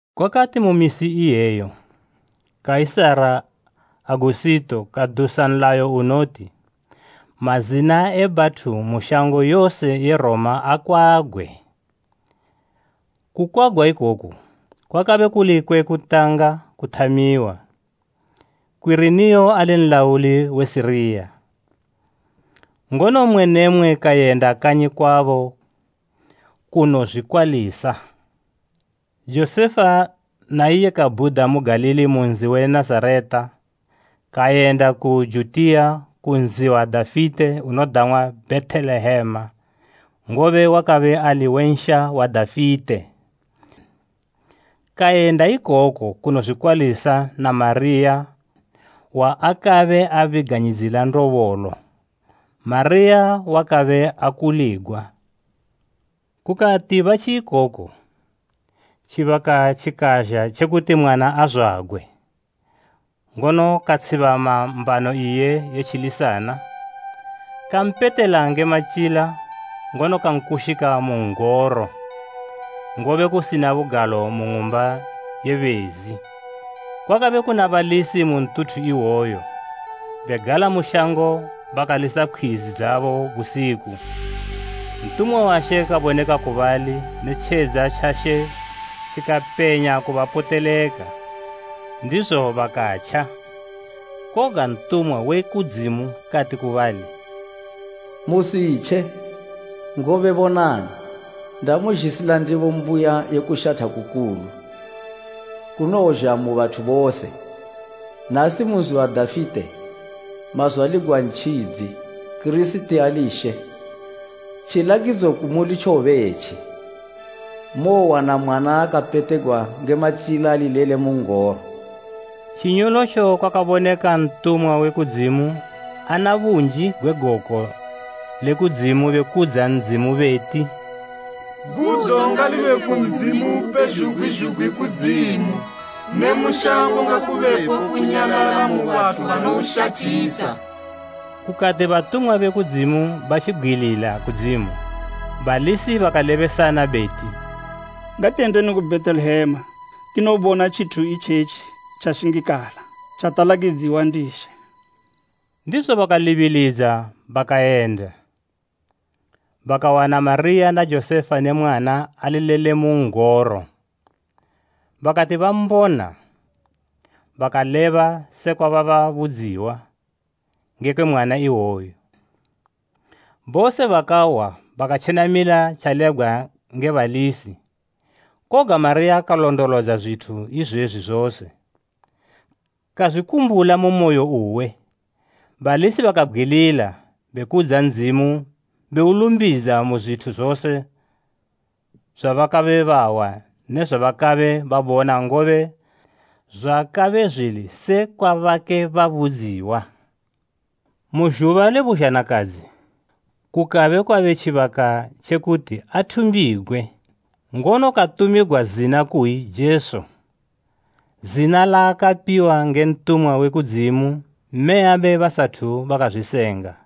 Kwakati mu misi iyeyo, Kaisara Agusito, kadusa nlayo unoti, mazina e bathu mu shango yose ye Roma akwagwe. Kukwagwa ikoku, kwakabe kuli kwe kutanga kuthamiwa, Kwiriniyo ali nlauli we Siriya. Ngono mmwe ne mmwe kayenda kanyi kwabo kunozwikwalisa. Josefa na iye kabhuda mu Galili mu nzi we Nazareta, kayenda ku Judiya ku nzi wa Dafite unodang'wa Bhetelehema, ngobe wakabe ali we nsha wa Dafite. Kayenda ikoko kunozwikwalisa na Mariya waakabe abiganyidzila ndobolo. Mariya wakabe akuligwa. Kukati batji ikoko, tjibaka tjikazha tjekuti mwana azwagwe, ngono katshibama mbano iye ye tjilisana. Kampetela nge matyila ngono kankushika mu n'goro, ngobe kusina bugalo mu ng'umba ye bezi. Kwakabe kuna balisi mu ntuthu iwoyo, begala mu shango bakalisa pkhwizi dzabo busiku. Ntumwa wa She kaboneka ku bali ne tjedza tja She tjikapenya kubapoteleka, ndizo bakatja. Koga ntumwa we kudzimu kati ku bali, “Musitje! Ngobe bonani, ndamuzhisila ndebo mbuya ye kushatha kukulu, kunowozha mu bathu bose. Nasi mu nzi wa Dafite, mazwaligwa Ntjidzi, Kirisiti ali She. Tjilakidzo kumuli tjowobe etji, mowowana mwana akapetegwa nge matyila ali lele mu n'goro.” Tjinyolotjo kwakaboneka ntumwa we kudzimu ana bunji gwe goko le kudzimu bekudza Ndzimu beti, “Gudzo ngalibe ku Ndzimu Upezhugwi zhugwi kudzimu, ne mu shango ngakubepo kunyalala mu bathu banoushathisa.” Kukati batumwa be kudzimu batjibgwilila kudzimu, balisi bakalebesana beti, “Ngatiyendeni ku Bhetelehema tinobona tjithu itjetji tjashingikala, tjatalakidziwa ndi She.” Ndizo bakalibilidza bakayenda, bakawana Mariya na Josefa ne mwana ali lele mu n'goro. Bakati bambona, bakaleba sekwa bababudziwa ngekwe mwana iwoyu. Bose bakahwa bakatjenamila tjalebwa nge balisi. Koga Mariya kalondolodza zwithu izwezwi zose, kazwikumbula mu moyo uwe. Balisi bakabgwilila, bekudza Ndzimu beulumbidza mu zwithu zose zwabakabe bahwa ne zwabakabe babona ngobe zwakabe zwili sekwa bakabe babudziwa. Mu zhuba le buzhanakadzi, kukabe kwabe tjibaka tjekuti athumbigwe, ngono katumigwa zina kuyi Jesu, zina laakapiwa nge ntumwa we kudzimu mmeyabe basathu bakazwisenga.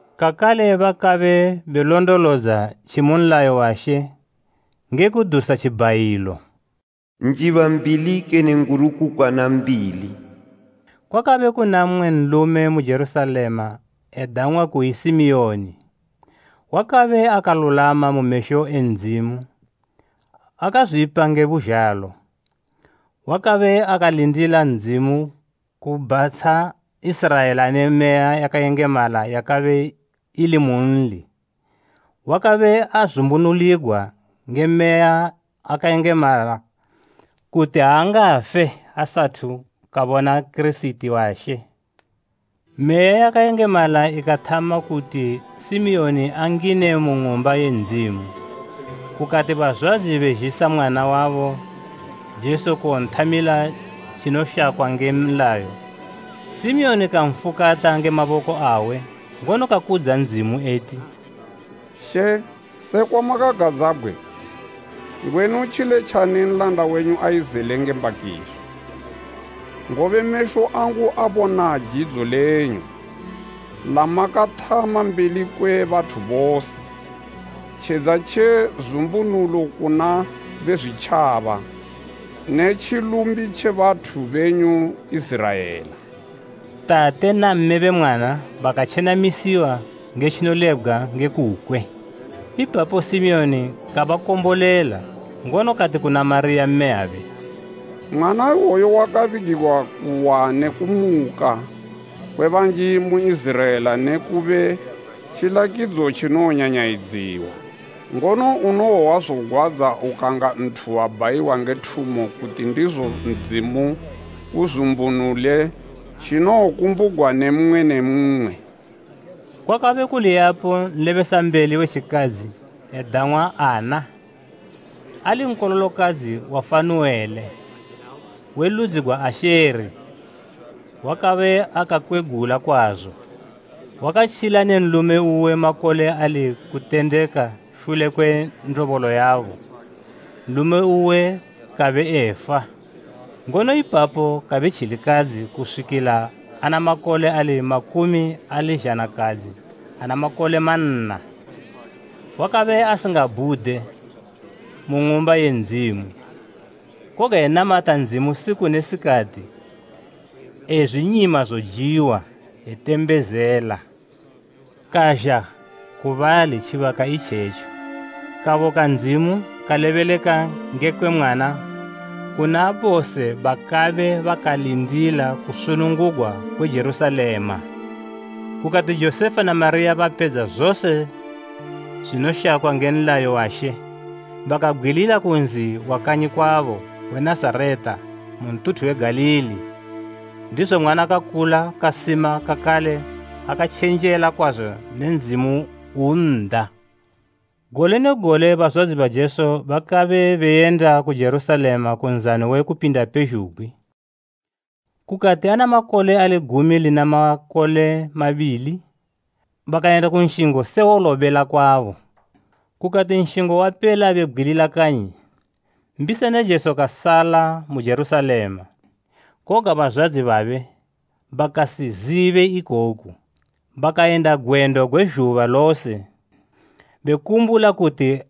kakale bakabe benolondolodza tjimu nlayo wa She nge kudusa tjibhayilo, “Njiba mbili kene ngurukukwana mbili.” Kwakabe kuna mmwe nlume mu Jerusalema edang'wa kuyi Simiyoni. Wakabe akalulwama mu mesho e Ndzimu akazwipa nge buzhalo. Wakabe akalindila Ndzimu kubhatsha Iziraela ne Meya yakayengemala yakabe ili munli. Wakabe azumbunuligwa nge Meya yakayengemala kuti aangafe asathu kabona Kirisiti wa She. Meya yakayengemala ikathama kuti Simiyoni angine mu ng'umba ye Ndzimu. Kukati bazwadzi bazhisa mwana wabo Jesu kuwonthamila tjinoshakwa nge nlayo, Simiyoni kamfukata nge maboko awe, ngono kakudza Ndzimu eti, “She, sekwa makagadzabgwe, ngwenu tjiletjani nlanda wenyu eyizele nge mbakiso. Ngobe mesho angu abona jidzo lenyu, lamakathama mbeli kwe bathu bose. Tjedza tje zumbunulo kuna be zwitjaba, ne tjilumbi tje bathu benyu Iziraela.” Tate na mme be mwana bakatjenamisiwa nge tjinolebgwa nge kukwe. Ipapo Simiyoni kabakombolela, ngono kati kuna Mariya mmeyabe, “Mwana iwoyu wakabigigwa kuwa ne kumuka kwe banji mu Iziraela ne kube tjilakidzo tjinowonyanyayidziwa. Ngono unowohwa zogwadza ukanga nthu wabhayiwa nge thumo kuti ndizo Ndzimu uzumbunule tjinokumbugwa ne mmwe ne mmwe.” Kwakabe kuli yapo nlebesambeli we tjikadzi edang'wa Anna, ali nkololokadzi wa Fanuele, we ludzi gwa Asheri. Wakabe akakwegula kwazo. Wakatjila ne nlume uwe makole ali kutendeka shule kwe ndobolo yabo, nlume uwe kabe efa. Ngono ipapo kabe tjilikadzi kuswikila ana makole ali makumi ali zhanakadzi ana makole manna. Wakabe asingabhude mu Ng'umba ye Ndzimu, koga enamata Ndzimu siku ne sikati, ezwinyima zojiwa, etembezela. Kazha ku bali tjibaka itjetjo, kaboka Ndzimu kalebeleka ngekwe mwana kuna bose bakabe bakalindila kusunungugwa kwe Jerusalema. Kukati Josefa na Mariya bapedza zose zwinoshakwa nge nlayo wa She, bakabgwilila ku nzi wa kanyi kwabo we Nazareta mu ntuthu we Galili. Ndizo mwana kakula kasima kakale akatjenjela kwazo ne Ndzimu un'da. Gole ne gole bazwadzi ba Jesu bakabe beyenda ku Jerusalema ku Nzano we Kupinda pezhugwi. Kukati ana makole ali gumi lina makole mabili, bakayenda ku nshingo se wolobela kwabo. Kukati nshingo wapela bebgwilila kanyi, mbisana Jesu kasala mu Jerusalema, koga bazwadzi babe bakasizibe ikoku. Bakayenda gwendo gwe zhuba lose bekumbula kuti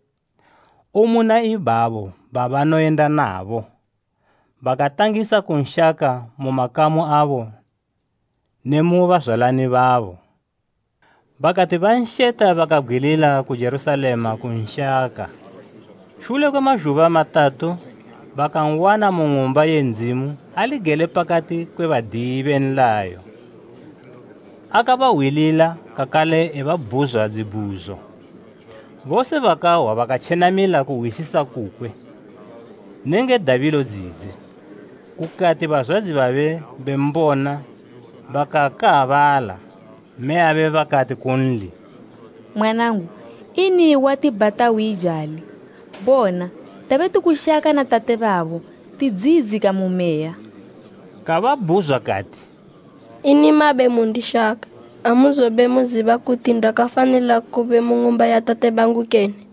umuna ibabo babanoyenda nabo. Bakatangisa kunshaka mu makamu abo ne mu bazwalani babo. Bakati bansheta bakabgwilila ku Jerusalema kunshaka. Shule kwe mazhuba matatu bakan'wana mu Ng'umba ye Ndzimu ali gele pakati kwe badiyi be nlayo, akabahwilila kakale ebabhuzwa dzibhuzo. Bose bakahwa bakatjenamila kuhwisisa kukwe nenge dabilo dzidze. Kukati bazwadzi babe bembona bakakaabala. Mmeyabe bakati kunli, “Mwanangu, ini watibhata uyijali! Bona, tabe tikushaka na tate babo, tidziyidzika mu meya.” Kababhuzwa kati, “Ini mabe mundishaka? Amuzobe muziba kuti ndakafanila kube mu ng'umba ya Tate bangu kene?”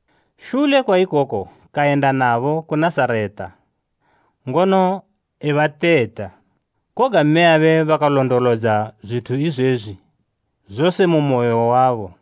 Shule kwa ikoko kayenda nabo ku Nazareta, ngono ebateta. Koga mmeyabe bakalondolodza zwithu izwezwi zose mu moyo wabo.